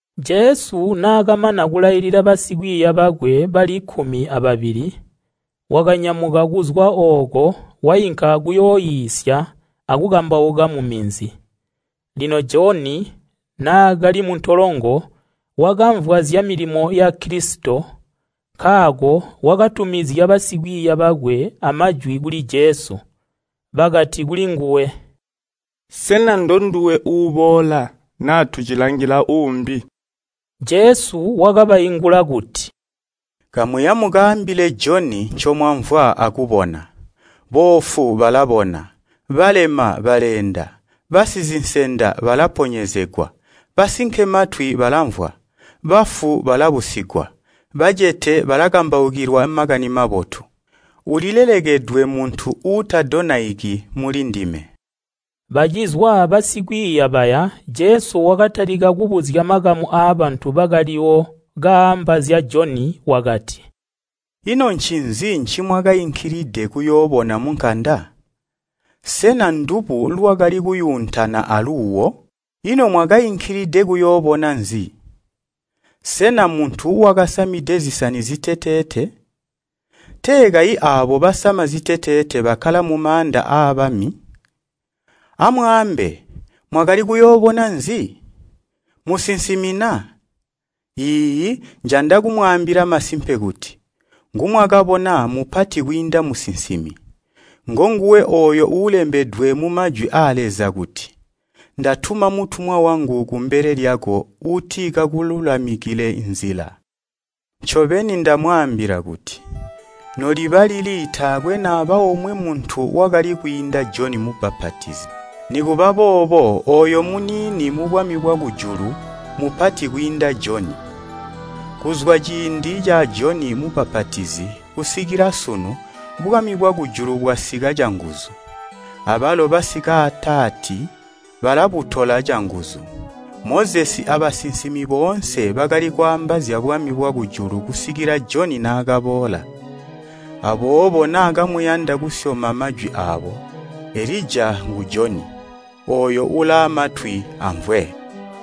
Jesu naakamana kulailila basikwiiya bakwe bali kkumi ababili, wakanyamuka kuzwa ooko wainka kuyooiisya akukambauka muminzi. Lino Joni naakali muntolongo wakamvwa zyamilimo ya Kilisito nkaako wakatumizya basikwiiya bakwe amajwi kuli Jesu. Bakati kulinguwe, “Sena ndonduwe uuboola, naa tucilangila uumbi?” Jesu wakabaingula kuti, “Kamuya mukaambile Joni ncomwamvwa akubona, boofu balabona balema baleenda, basizinsenda balaponyezegwa, basinkematwi balamvwa, bafu balabusigwa, bacete balakambaukilwa Makani Mabotu. Ulilelekedwe muntu uutadonaiki mulindime.” Bacizwa basikwiiya baya Jesu wakatalika kubuzya makamu aabantu bakaliwo kaamba zya Joni wakati, “Ino ncinzi ncimwakainkilide kuyoobona munkanda? Sena ndubu lwakali kuyuuntana aluuwo? Ino mwakainkilide kuyoobona nzi? Sena muntu wakasamide zisani ziteteete? Tee kayi aabo basama ziteteete bakkala mumaanda aabami. Amwaambe, mwakali kuyoobona nzi? Musinsimi na? Iiyi njanda kumwaambila masimpe kuti, ngumwakabona mmupati kwiinda musinsimi. Ngonguwe ooyo uulembedwe mumajwi aa Leza kuti, ‘Ndatuma mutumwa wangu kumbele lyako uuti kakululamikile nzila.’ Ncobeni ndamwaambila kuti, noliba lili taakwe naba omwe muntu wakali kwiinda Joni Mubbapatizi. Nikuba boobo ooyo muniini mubwami bwakujulu mupati kwiinda Joni. Kuzwa ciindi ca Joni Mubbapatizi kusikila sunu bwami bwakujulu bwasika canguzu, abalo bankutwe balabutola canguzu. Mozesi abasinsimi boonse bakali kwaamba zyabwami bwakujulu kusikila Joni naakaboola. Aboobo naa kamuyanda kusyoma majwi aabo, Elija ngu Joni. Ooyo ulaamatwi amvwe!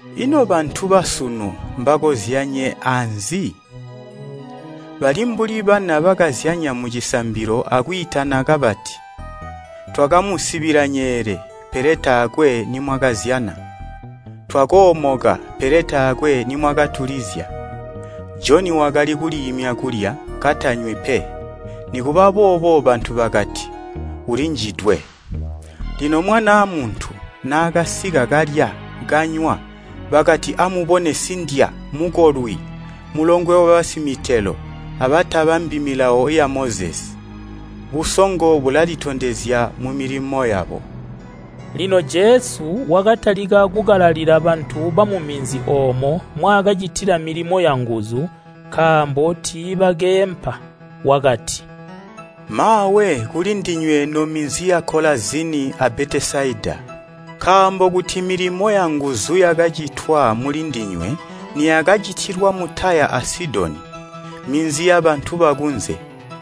“Ino bantu basunu mbakozyanye aanzi? Bali mbuli bana bakazyanya mucisambilo akwiitana kabati, ‘Twakamusibila nyeele, pele taakwe nimwakazyana! Twakoomoka pele taakwe nimwakatulizya.’ Joni wakali kuliimya kulya, katanywi pe, nikuba boobo bantu bakati, ‘Ulinjidwe!’ Lino Mwanaa Muntu naakasika kalya, kanywa, bakati, ‘Amubone sindya, mukolwi, mulongwe wabasimitelo abatabambi milawo ya Mozesi!’ Musongo ulalitondezya mumilimo yakwe.” Lino Jesu wakatalika kukalalila bantu bamu minzi oomo mwaakacitila milimo yanguzu nkaambo tiibakeempa. Wakati, “Maawe kulindinywe nominzi ya Kolazini a Betesaida! Nkaambo kuti milimo yanguzu yakacitwa mulindinywe niyakacitilwa mu Taya a Sidoni, minzi yabantu bakunze,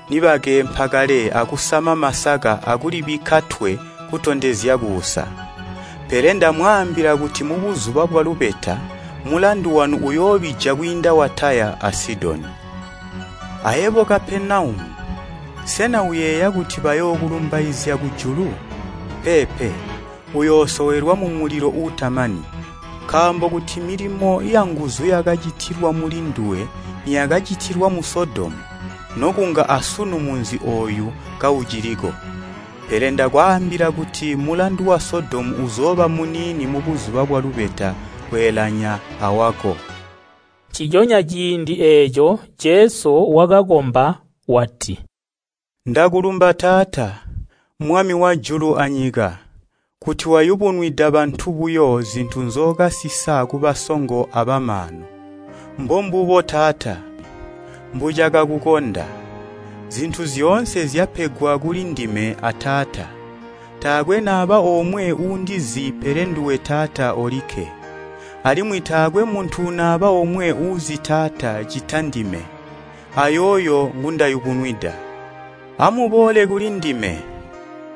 nibakeempa kale akusama masaka akulibikka twe kutondezya kuusa. Pele ndamwaambila kuti mubuzuba bwalubeta mulandu wanu uyoobija kwiinda wa Taya a Sidoni. Ayebo Kapenaumu, sena uyeeya kuti bayookulumbaizya kujulu? Peepe, uyoosowelwa mumulilo uutamani. Nkaambo kuti milimo yanguzu yakacitilwa mulinduwe niyakacitilwa mu Sodomu, nokunga asunu munzi ooyu kauciliko. Pele ndakwaambila kuti mulandu wa Sodomu uzooba muniini mubuzuba bwalubeta kweelanya awako.” Nciconya ciindi eeco Jesu wakakomba wati, “Ndakulumba Taata, Mwami wajulu anyika kuti wayubunwida bantu buyo zintu nzookasisa kubasongo abamaanu. Mbombubo Taata, mbucakakukonda. Zintu zyoonse zyapegwa kuli ndime a Taata. Taakwe naba omwe uundizi pele nduwe Taata olikke. Alimwi taakwe muntu naba omwe uuzi Taata ccita ndime, ayooyo ngundayubunwida. “Amuboole kulindime,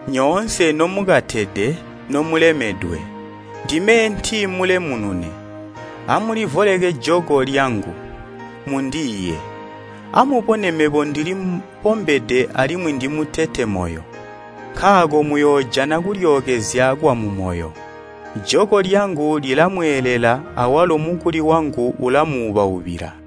nyoonse nomukatede nomulemedwe, ndime eenti mulemunune. Amulivoleke joko lyangu, mundiiye. Amubone mebo ndili bombede alimwi ndimutete moyo, nkaako muyoojana kulyookezya kwa mumoyo. Joko lyangu lilamweelela awalo mukuli wangu ulamuubaubila.”